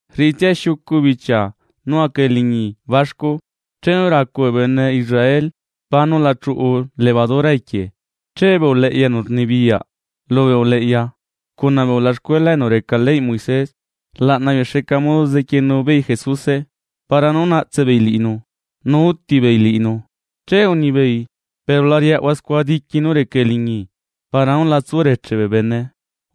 Rriꞌitsia xiucu bichia nú aca eliñi baxcu, chenu racu bee bene Israel pá nú la chuꞌu levadura equie, che bee uleꞌya enu rnibiyaꞌ lubee uleꞌya cuna bee ulaxcuela enu reca leyꞌ Moisés, rlaꞌna beei xa modo zequienu beei Jesuse para nú naꞌtse beei liꞌinu nu úti beei liꞌinu. Che unibeei: ―Pero la riaꞌahua scua diqui nú reca eliñi, para nú la tsu reche bee bene.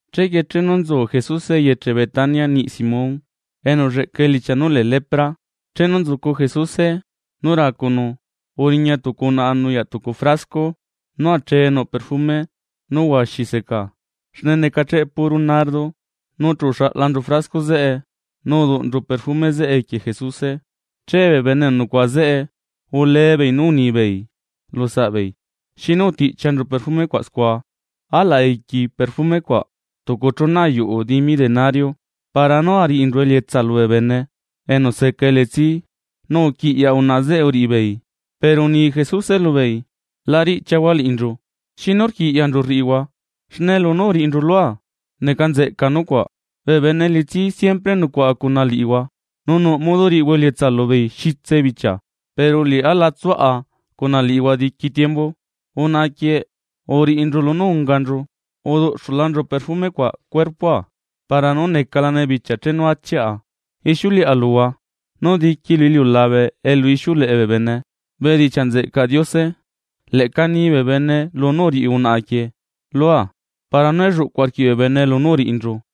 Chequie chenu nzu Jesuse eyeche Betania niꞌi Simón enu ulleꞌca elichia nú lee lepra, chenu nzucu Jesuse lumexa racunu, uriña tucu unaꞌa nuyaꞌ tucu frasco nú achee nuꞌ perfume nú huaxi secaa, xne necacheꞌe puro nardo, nu chu uxaꞌlanchu frasco zeꞌe nu udunchu perfume zeꞌe equie Jesuse. Che bee bene enu nucuaꞌa zeꞌe ulee beei nú unibeei lu saꞌbeei: ―¿Xinu utiꞌchianchu perfume cuaꞌ scua? Alaꞌ aiqui perfume cuaꞌ tucu chuna ayuꞌu dimi denario para nú ariꞌinchu elietsa lubee bene enu seca elitsi, nu uquiꞌyaꞌ unaꞌa zeꞌe uriꞌi beei. Pero uni Jesuse lubeei: ―La riꞌchiahua liꞌinchu; ¿xinu rquiꞌyanchu rriꞌihua? Xne lunú uriꞌinchu lua, neca nzeꞌca nucuaꞌ. Bee bene elitsi siempre nucuaꞌa cuna liꞌihua, nu nuꞌ modo riꞌihua elietsa lubeei xitse bichia. Pero liꞌá la tsuaꞌa cuna liꞌihua diqui tiembu. Unaꞌa quieꞌ uriꞌinchu lunú unganchu, uduꞌxulanchu perfume cuaꞌ cuerpoa para nú necalane bichia chenu achiꞌa. Ixiuleꞌa luhua, nú diqui lu iliulabe elu ixiuleꞌe bee bene bedichiaꞌ nzeꞌcaꞌ Diose, leꞌca ni bee bene lunú uriꞌi unaꞌa quieꞌ lua para nú elluꞌcuꞌ arquiꞌ bee bene lunú uriꞌinchu lua.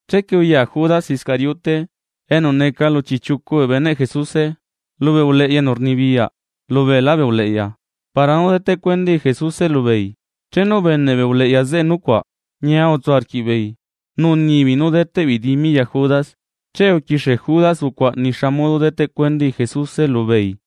Chequie uya Judas Iscariote enu neca lu chiꞌchiucu bee beneꞌ Jesuse, lubee uleꞌya enu rnibiyaꞌ lubee lá bee uleꞌya para nú deteꞌ cuendai Jesuse lubeei. Chenu ubeneꞌ bee uleꞌya zeꞌe nucuaꞌ, ñia utsu arquiꞌbeei nu unibeei nú deteꞌ beei dimi ya Judas, che uquixie Judas ucuaꞌana xa modo deteꞌ cuendai Jesuse lubeei.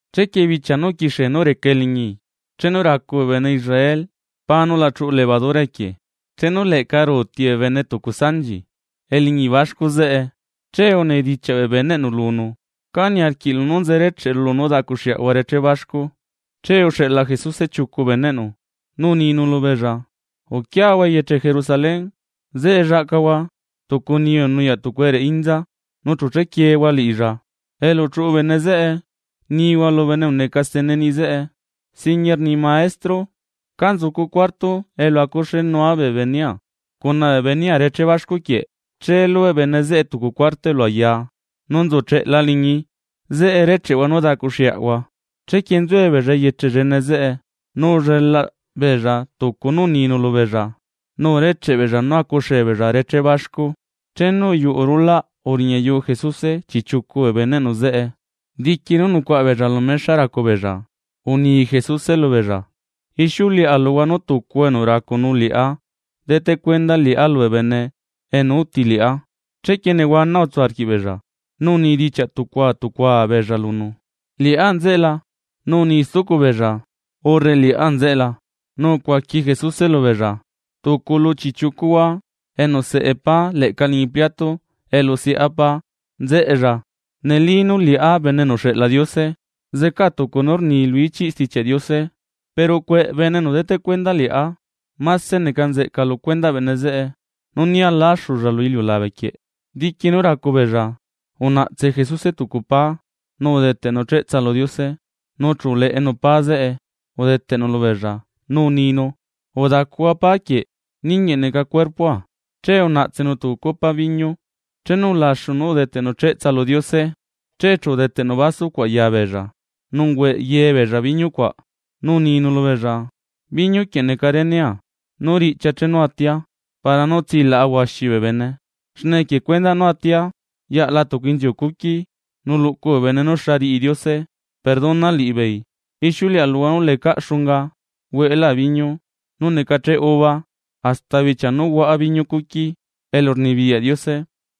Chequie bichia nú uquixie nú reca eliñi chenu racu bee bene Israel pá nú la chuꞌu levadura equie, chenu leꞌca ruuti bee bene tucu sanchi eliñi baxcu zeꞌe che unidichiaꞌ bee beneꞌnu lunu: ―¿Cá niarquiꞌlu nú nze recheꞌru nú daꞌcuxeꞌahua reché baxcu? Che uxeꞌla Jesuse chiucu beneꞌnu nu uninu lubeella: ―Uquiahua eyeche Jerusalén, zeꞌe llaꞌcahua tucu niyu enu nuyaꞌ tucu ereꞌe inza nu chu chequiehua liꞌilla. Elu chuꞌu bene zeꞌe, nihua lu bene enu neca stene niꞌi zeꞌe: “Singuie rni Maestro: ¿Ca nzucu cuarto elu acuxeenua bee benea reché baxcu quieꞌ?” Che lubeꞌ bene zeꞌe tucu cuarto elu ayaa nú nzu cheꞌela liñi, zeꞌe recheꞌhua nú daꞌcuxeꞌahua. Chequie nzuebeella eyeche llene zeꞌe, nu ullelaꞌ beella tucu nú uninu lubeella nu urecheꞌe beella nú acuxee beella reché baxcu. Chenu uyuꞌu rulaꞌ uriñayuu Jesuse chiꞌchiucu bee beneꞌnu zeꞌe. Diqui nú nucuaꞌa beella lu mexa racu beella uni Jesuse lubeella: ―Ixiuleꞌa luhua nú tucuhua enu racunu liꞌá deteꞌcuenda liꞌá lubee bene enu uti liꞌá. Chequie nehuana utsu arquiꞌbeella, nu unidichiaꞌ tucua tucua beella lunu: ―¿Liꞌá nzeꞌe la? Nu uni stucu beella: ―¿Liꞌá nzeꞌe la? Nu ucuaqui Jesuse lubeella: ―Tucu lu chiꞌchiucuhua enu seꞌe pá leꞌca liñi pliato elu seꞌa pá nzeꞌella. Neli nú liꞌá Bene enu uxeꞌla Diose, zecaa tucu nú rni lu ichiꞌ Stichiaꞌ Diose; pero ¿cueꞌe bene enu deteꞌ cuenda liꞌá? Máse neca nzeꞌca lu cuendaꞌ bene zeꞌe nú né aláxulla lu iliulabe quieꞌ. Diqui nú racu beella, unaꞌtse Jesuse tucu pá nu udeteꞌnu cheꞌtsa lu Diose nu chu uleꞌenu pá zeꞌe udeteꞌnu yabeella nu uninu: ―Udacuhua pá quieꞌ, ninguieꞌ neca cuerpoa. Che unaꞌtsenu tucu copa viñu, chenu ulaxu nú udeteꞌnu cheꞌtsa lu Diose, che chu udeteꞌnu vaso cuaꞌ ya beella nu ungueꞌ ye beella biñu cuaꞌ. Nu uninu lubeella: ―Biñu quieꞌ neca renea nú riꞌchia chenu atia para nú tsilaꞌa huaxi bee bene, xne equie cuendaꞌ nú atia yaꞌla tucu inziu cuqui nú luꞌcu bee bene nú xa riꞌi Diose perdona liꞌibeei. Ixiuleꞌa luhua nú lecaꞌ xunga hueꞌelá biñu nú necacheꞌ uva, hasta bichia nú huaꞌa biñu cuqui elu rnibiyaꞌ Diose.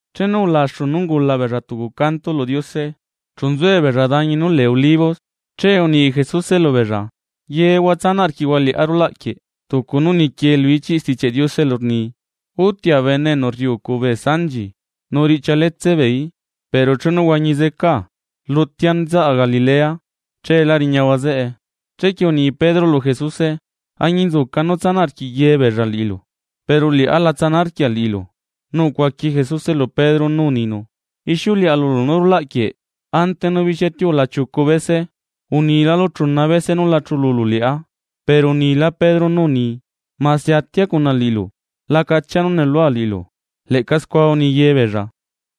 Chenu ulaxu nú ungula beella tucu canto lu Diose, chu nzuebeella dañi nú lee Olivos. Che uni Jesuse lubeella: ―Yehua tsanaꞌ arquiꞌhua liꞌá rulaꞌ quieꞌ; tucu nú nequie lu ichiꞌ Stichiaꞌ Diose elu rni: “Utia bene enu rriucu bee sanchi, nu riꞌchia letse beeí.” Pero chenu huañi zecaa rlutia nzaꞌa Galilea, cheela riñahua zeꞌe. Chequie uni Pedro lu Jesuse: ―Añinzuca nú tsanaꞌ arquiꞌ ye beella liꞌilu, pero liꞌá la tsana arquia liꞌilu. Nu ucuaqui Jesuse lu Pedro nú uninu: ―Ixiuleꞌa lulu nú rulaꞌ quieꞌ ante nú bixia tiula chiucu bese, unilalu chuna bese nú la chululu liꞌá. Pero unila Pedro nú uni: ―Mase atia cuna liꞌilu, la cachia nú nuꞌlua liꞌilu. Leꞌca scua uni ye beella.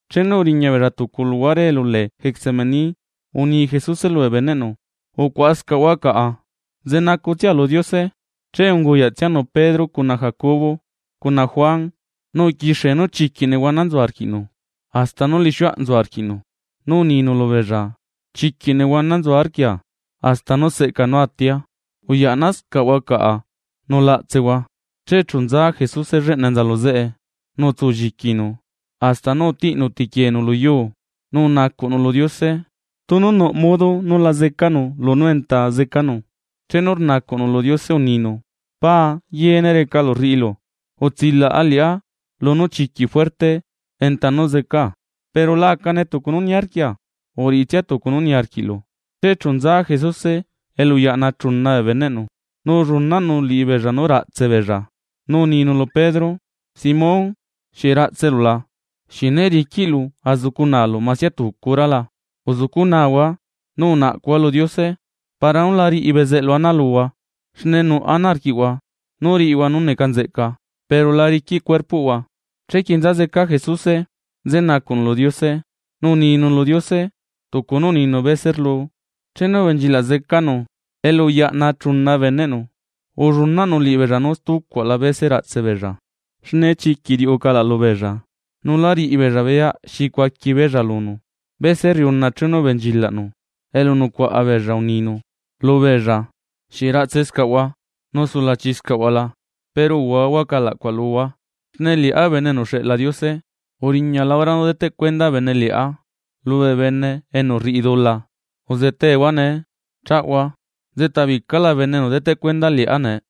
Chenu uriña beella tucu luhuare elu lee Getsemaní uni Jesuse lubee beneꞌnu: ―Ucuaꞌascaꞌhua caꞌa, nze nacutsia lu Diose. Che unguyaꞌtsianu Pedro cuna Jacobo cuna Juan, nu uquixie nú chiquiꞌ nehuana nzu arquiꞌnu, hasta nú lixiuaꞌ nzu arquiꞌnu. Nu uninu lubeella: ―Chiquiꞌ nehuana nzu arquia, hasta nú seꞌca nú atia, uyaꞌnascaꞌhua caꞌa nu la aꞌtsehua. Che chu nza Jesuse lleꞌna enza lu zeꞌe, nu utsulliquinu hasta nú utiꞌnu tequieenu lu yuu, nu unacuꞌnu lu Diose tunu nuꞌ modo nú la zecanu lunú enta zecanu. Chenu rnacuꞌnu lu Diose uninu: ―Paa, yeene recalu rriꞌilu; utsilaꞌa liꞌá lunú chiquiꞌ juerte enta nú zecaa, pero la acane tucu nú niarquia, uriꞌitsia tucu nú niarquiꞌlu. Che chu nza Jesuse elu uyaꞌna chuna beneꞌnu nu ullunaꞌnu liꞌibeella nú raꞌtse beella nu uninu lu Pedro: ―Simón, ¿xieꞌ raꞌtselu la? ¿Xieꞌ né riquiꞌlu azucu naalu masia tucu hora la? Uzucunahua, nu unaꞌcuhua lu Diose para nú la riꞌi bezeꞌlu ana luhua, xne nuꞌ ana arquiꞌhua nú riꞌihua nú neca nzeꞌca, pero la riquiꞌ cuerpoꞌhua. Chequie nza zeca Jesuse, nze nacuꞌnu lu Diose nu uninu lu Diose tucu nú uninu bese rluu. Chenu ubenchilaꞌ zecanu elu uyaꞌna chuna beneꞌnu ullunaꞌnu liꞌibeella nú stucuaꞌla bese raꞌtse beella, xne chiquiꞌ riuꞌu calaꞌ lubeella nu lá riꞌi beella beyaꞌ xi cuaqui beella lunu. Bese rriuna chenu ubenchilaꞌnu elu nucuaꞌa beella uninu lubeella: ―¿Xieꞌ ratsescaꞌhua nu sulachi scaꞌhua la? Pero uhuahua calaꞌ cuaꞌ luhua, xne liꞌá Bene enu uxeꞌla Diose uriñala hora nú deteꞌ cuenda bene liꞌá lubee bene enu rriꞌi dula. Uzetehua ne chaꞌahua. Nzeꞌta bicala bene enu deteꞌ cuenda liꞌá nee.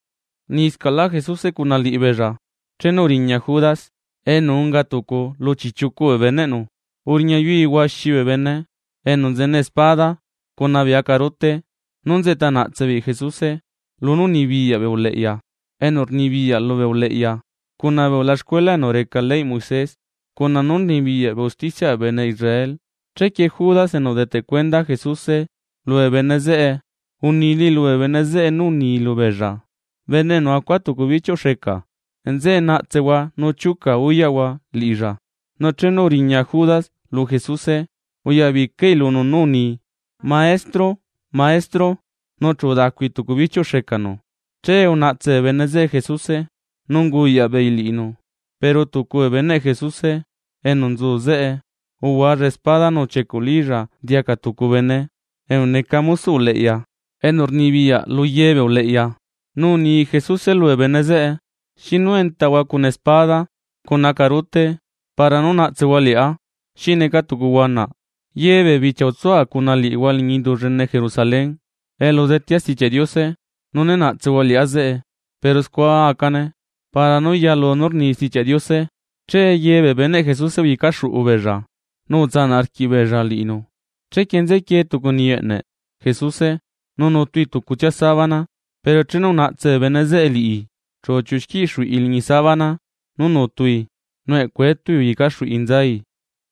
Rniscaꞌlá, Jesuse cuna liꞌibeella chenu uriña Judas enu unga tucu lu chiꞌchiucu bee beneꞌnu, uriña yui huaxi bee bene enu nzene espada cuna bee acarute. Nú nzeꞌta naꞌtse beei Jesuse lunú unibiyaꞌ bee uleꞌya enu rnibiyaꞌ lubee uleꞌya cuna bee ulaxcuela enu reca leyꞌ Moisés cuna nú rnibiyaꞌ bee usticiaꞌ bee bene Israel. Chequie Judas enu udeteꞌ cuenda Jesuse lubee bene zeꞌe, unilai lubee bene zeꞌe nú uni lubeella: ―Bene enu acua tucu bichiuꞌ xeca, nzeꞌe naꞌtsehua nu chiuca uyaꞌhua liꞌilla. Nu chenu uriña Judas lu Jesuse uyabicai lunu nú uni: ―Maestro, Maestro. Nu chu udacui tucu bichiuꞌ xecanu. Che unaꞌtse bee bene zeꞌe Jesuse nu unguyaꞌ beei liꞌinu. Pero tucu bee beneꞌ Jesuse enu nzu zeꞌe uhualla espada nu uchiecuꞌlílla diaca tucu bene enu neca mosoꞌ uleꞌya enu rnibiyaꞌ lu ye bee uleꞌya. Nu uni Jesuse lubee bene zeꞌe: ―¿Xinu entahua cuna espada cuna acarute para nú naꞌtsehua liꞌá xineca tucu huanaꞌ? Ye bichia nzua cuna liꞌihua liñi indu llene Jerusalén elu uzetea Stichiaꞌ Diose nu né naꞌtsehua liꞌá zeꞌe. Pero scua acane para nú yalu nú rni Stichiaꞌ Diose. Che ye bee beneꞌ Jesuse uyecaxuꞌu beella nu utsanaꞌ arquiꞌbeella liꞌinu. Chequie nzequie tucu niyu eꞌneꞌ Jesuse nu nutui tucutsia sábana. Pero chenu unaꞌtse bee bene zeꞌe liꞌi, chu uchiuꞌu xquiꞌ xuꞌi liñi sábana, nú nutui nu eꞌcu etui uyecaxuꞌi nzai.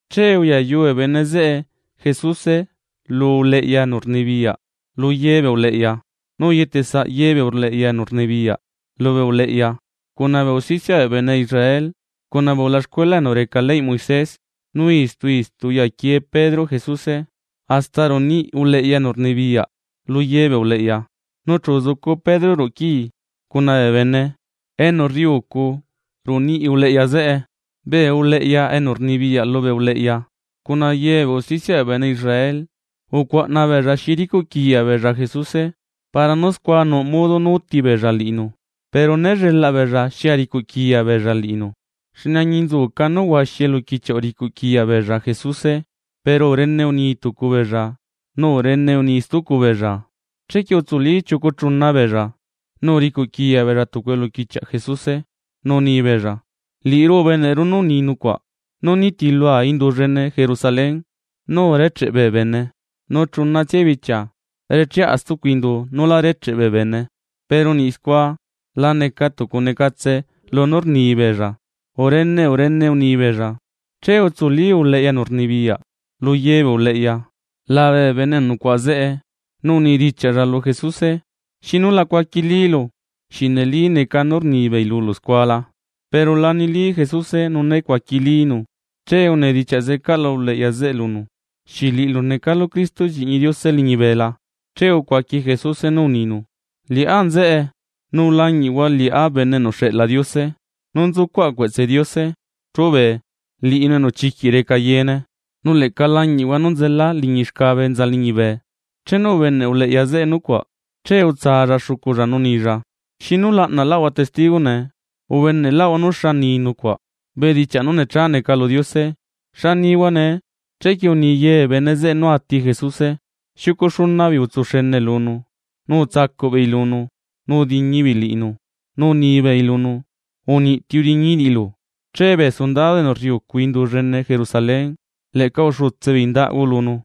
Che uyayu bee bene zeꞌe Jesuse lu uleꞌya enu rnibiyaꞌ lu ye bee uleꞌya, nu uyetesaꞌ ye bee uleꞌya enu rnibiyaꞌ lubee uleꞌya, cuna bee usticiaꞌ bee bene Israel cuna bee ulaxcuela enu reca leyꞌ Moisés. Nu istu istu uyaquie Pedro Jesuse hasta ruꞌu niꞌi uleꞌya enu rnibiyaꞌ luye bee uleꞌya, nu chu uzucu Pedro ruꞌu quii cuna bee bene enu rriucu ruꞌu niꞌi uleꞌya zeꞌe. Bee uleꞌya enu rnibiyaꞌ lubee uleꞌya cuna ye bee usticiaꞌ bee bene Israel, ucuaꞌna beella xi ricuꞌ quiya beella Jesuse para nú scua nuꞌ modo nú utibeella liꞌinu. Pero né llelaꞌ beella xi aricuꞌ quiya beella liꞌinu. Xne añinzuca nú huaxi eluquichiaꞌ uricuꞌ quiya beella Jesuse, pero urene uni tucu beella nu urene uni stucu beella. Chequie utsuli chiucu chuna beella nu uricuꞌ quiya beella tucu eluquichiaꞌ Jesuse nu unibeella: ―Liꞌiru ubeneꞌru nú uni nucuaꞌ: Liꞌá nitilua indu llene Jerusalén nú urecheꞌe bee bene, nu chunatsia bichia recheꞌa stucu indu nú lá recheꞌ bee bene. Pero niꞌ scua la neca tucu necatse lunú rni beella urene urene uni beella. Che utsuli uleꞌya enu rnibiyaꞌ lu ye bee uleꞌya labe bee bene enu nucuaꞌa zeꞌe nu unidichiaꞌlla lu Jesuse: ―¿Xinu la cuaquilílu? ¿Xieꞌ neli neca nú rnibeei lulu scua la? Pero la nili Jesuse nu né cuaquilínu che unidichiaꞌ zecaꞌla uleꞌya zeꞌe lunu: ―¿Xieꞌ liꞌilu necalu Cristo lliꞌñi Diose liñibe la? Che ucuaqui Jesuse nú uninu: ―Liꞌá nzeꞌe nu lañiꞌhua liꞌá Bene enu uxeꞌla Diose nú nzucuaꞌa cueꞌtse Diose chúbee liꞌinu enu chiquiꞌ reca yeene, nu leꞌca lañiꞌhua nú nzela liñi xcabe enza liñibe. Chenu ubeneꞌ uleꞌya zeꞌe nucuaꞌa, che utsalla xuculla nu unilla: ―¿Xinu laꞌnalaꞌahua testigo nee? Ubeneꞌlaꞌhua nú xa uni nucuaꞌa bedichiaꞌ nú necha neca lu Diose; ¿xa nihua nee? Chequie uni ye bee bene zeꞌe nú ati Jesuse. Xiucu xuna beei utsu xene lunu nu utsacuꞌ beei lunu nu udiñi beei liꞌinu nu unibeei lunu: ―¡Uniꞌti udiñi liꞌilu! Che bee sundado enu rriucu indu llene Jerusalén leꞌca uxutse beei ndaꞌgu lunu.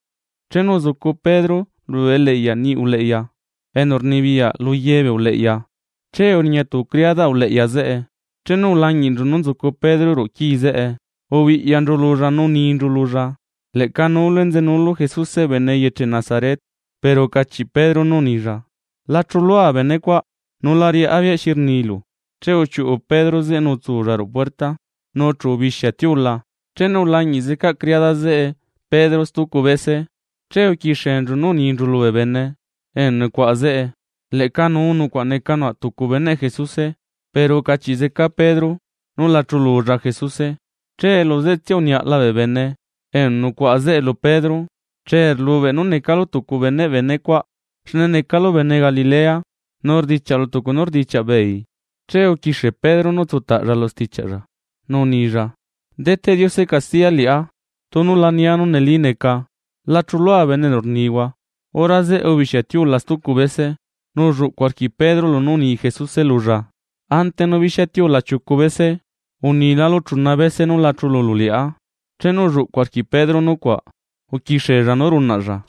Chenu uzucu Pedro ruꞌu eliꞌyaꞌ niꞌi uleꞌya enu rnibiyaꞌ luye bee uleꞌya, che uriña tucu criadaꞌ uleꞌya zeꞌe. Chenu ulañiꞌnchu nú nzucu Pedro ruꞌu quii zeꞌe ubiꞌyanchu lulla nu uninchu lulla: ―Leꞌca nuulu enzenuulu Jesuse bene eyeche Nazaret. Pero ucachiꞌ Pedro nú unilla: ―La chuꞌlua benecuaꞌ, nu la riꞌá beyaꞌ xi rnilu. Che uchiuꞌu Pedro zeꞌe nu utsulla ruꞌu puerta nu chu ubixia tiula. Chenu ulañiꞌ zeca criada zeꞌe Pedro stucu bese, che uquixienchu nú uninchu lubee bene enu nucuaꞌa zeꞌe: ―Leꞌca nuu nucuaꞌ neca nucuaꞌ tucu beneꞌ Jesuse. Pero ucachiꞌ zeca Pedro nú la chululla Jesuse. Che lu zeꞌe tsia uniaꞌala bee bene enu nucuaꞌa zeꞌe lu Pedro: ―Che rlubeꞌ nú necalu tucu beneꞌ benecuaꞌ, xne necalu bene Galilea nu rdichiaꞌlu tucu nú rdichiaꞌbeei. Che uquixie Pedro nú utsutaꞌlla lu stichiaꞌlla nú unilla: Deteꞌ Diose castiya liꞌá tunu la nia nú neli neca. ―¡La chulua bene enu rnihua! Hora zeꞌe ubixia tiula stucu bese nu ulluꞌcu arquiꞌ Pedro lunú uni Jesuse lulla: “Ante nú bixia tiula chiucu bese, unilálu chuna bese nú la chululu liꞌá.” Chenu ulluꞌcu arquiꞌ Pedro nucuaꞌ uquixiella nú runaꞌlla.